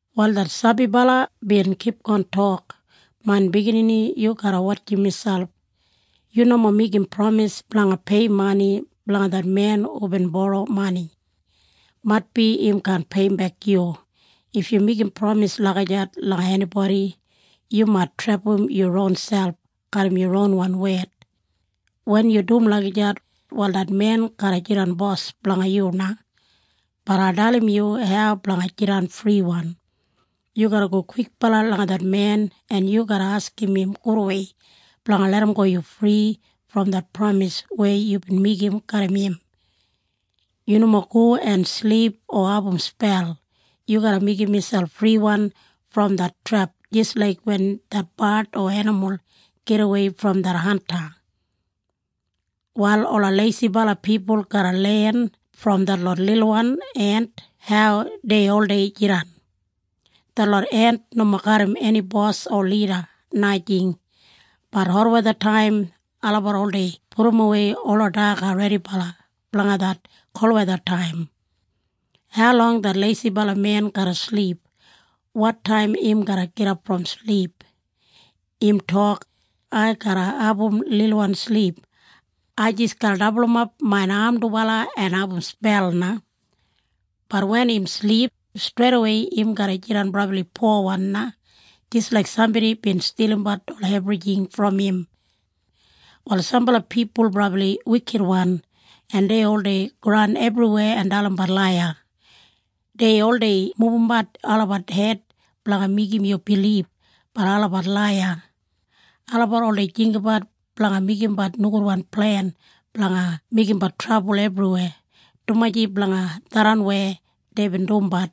Wal det sabibala bin kipgon tok, “Main biginini, yu garra wotjim miselp. Yu nomo meigim pramis blanga pei mani blanga det men hubin boro mani. Maitbi im kaan peiyimbek yu. If yu meigim pramis lagijat langa enibodi, yu mait trepam yu ronselp garram yu ronwan wed. Wen yu dum lagijat, wal det men garra jidan bos blanga yu na. Bat ai dalim yu hau blanga jidan friwan. Yu garra go kwikbala langa det men en yu garra askim im gudwei blanga larramgo yu fri brom det pramis weya yubin meigim garram im. Yu nomo go en silip o abum spel. Yu garra meigim miselp friwan brom det trep jis laik wen det bard o enimul gidawei brom det hanta. “Wal ola leisibala pipul garra len brom detlot lilwan ent hau dei oldei jidan. Detlot ent nomo garram eni bos o lida, najing, bat hotwethataim olabat oldei pudumwei ola daga redibala blanga det kolwethataim. Haulong det leisibala men garra silip? Wotaim im garra gidap brom silip? Im tok, ‘Ai garra abum lilwan silip. Ai jis garra dabulumap main am dubala en abum spel na.’ Bat wen im silip, streidawei im garra jidan brabli powan na, jis laik sambodi bin stilimbat ola ebrijing brom im. “Wal sambala pipul brabli wikitwan en dei oldei goran ebriweya en dalimbat laiya. Dei oldei mubumbat olabat hed blanga meigim yu bilib, bat olabat laiya. Olabat oldei jinggabat blanga meigimbat nogudwan plen blanga meigimbat trabul ebriweya. Dumaji blanga tharran weya deibin dumbat,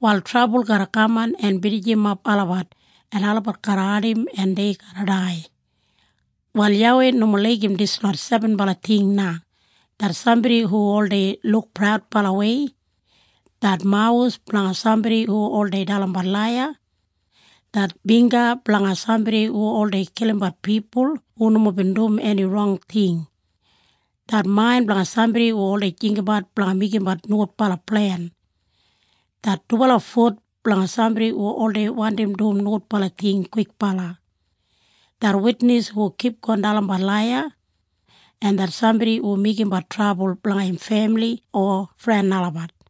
wal trabul garra kaman en binijimap olabat en olabat garra ardim en dei garra dai. “Wal YAWEI nomo laigim dislot sebenbala ting na, det sambodi hu oldei luk praudbalawei, det mawus blanga sambodi hu oldei dalimbat laiya, det bingga blanga sambodi hu oldei kilimbat pipul hu nomo bin dum eni rong ting, det main blanga sambodi hu oldei jinggabat blanga meigimbat nogudbala plen, det dubala fut blanga sambodi hu oldei wandim dum nogudbala ting kwikbala, det witnis hu kipgon dalimbat laiya, en det sambodi hu meigimbat trabul blanga im femili o fren olabat.”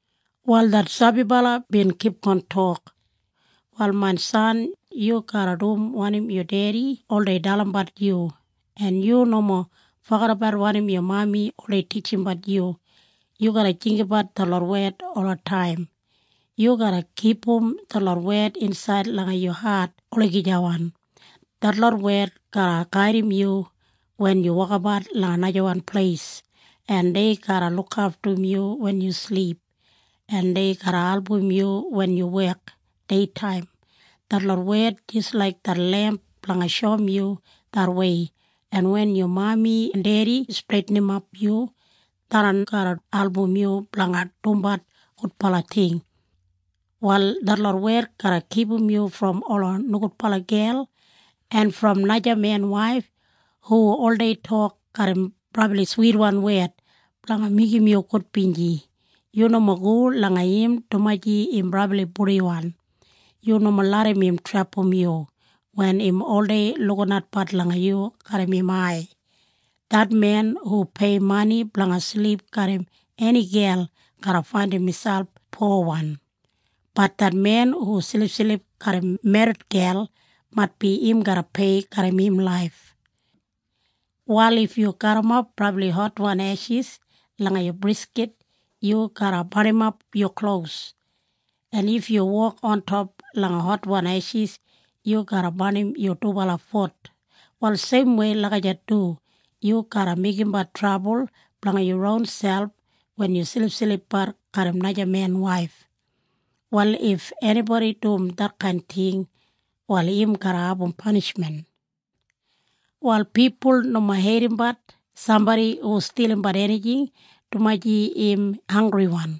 Wal det sabibala bin kipgon tok, “Wal main san, yu garra dum wanim yu dedi oldei dalimbat yu, en yu nomo fogedabat wanim yu mami oldei titjimbat yu. Yu garra jinggabat detlot wed olataim. Yu garra kipum detlot wed insaid langa yu hat olagijawan. Detlot wed garra gaidim yu wen yu wokabat langa najawan pleis en dei garra lukaftum yu wen yu silip, en dei garra album yu wen yu wek deitaim. Detlot wed jis laik det lemp blanga shoum yu det wei, en wen yu mami en dedi streitinimap yu, tharran garra album yu blanga dumbat gudbala ting. “Wal detlot wed garra kipum yu brom ola nogudbala gel en brom najamen waif hu oldei tok garram brabli switwan wed blanga meigim yu gudbinji. Yu nomo go langa im dumaji im brabli purdiwan. Yu nomo larram im trepam yu wen im oldei lukinatbat langa yu garram im ai. Det men hu pei mani blanga silip garram eni gel garra faindim miselp powan, bat det men hu silipsilip garram merrit gel maitbi im garra pei garram im laif. “Wal if yu garrimap brabli hotwan eshis langa yu briskit yu garra barnimap yu klos. En if yu wok ontop langa hotwan eshis yu garra barnim yu dubala fut. Wal seimwei lagijat du yu garra meigimbat trabul blanga yu ronselp wen yu silipsilipbat garram najamen waif. Wal if enibodi dum detkain ting, wal im garra abum panishmen. “Wal pipul nomo heidimbat sambodi hu stilimbat enijing dumaji im hanggriwan,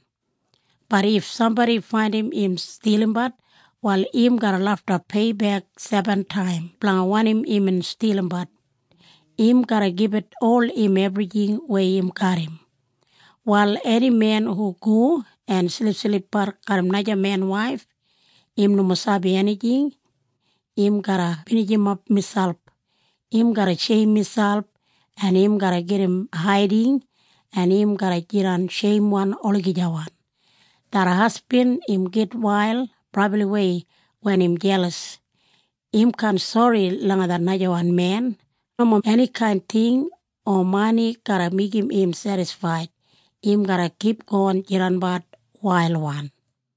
bat if sambodi faindim im stilimbat, wal im garra lafta peibek sebentaim blanga wanim imbin stilimbat. Im garra gibit ol im ebrijing weya im garram. “Wal eni men hu go en silipsilipbat garram najamen waif, im nomo sabi enijing. Im garra binijimap miselp. Im garra sheim miselp en im garra gedim haiding en im garra jidan sheimwan olagijawan. Det hasbin im gitwail brabliwei wen im jelas. Im kaan sori langa det najawan men. Nomo enikain ting o mani garra meigim im sedisfaid! Im garra kipgon jidanbat wailwan!”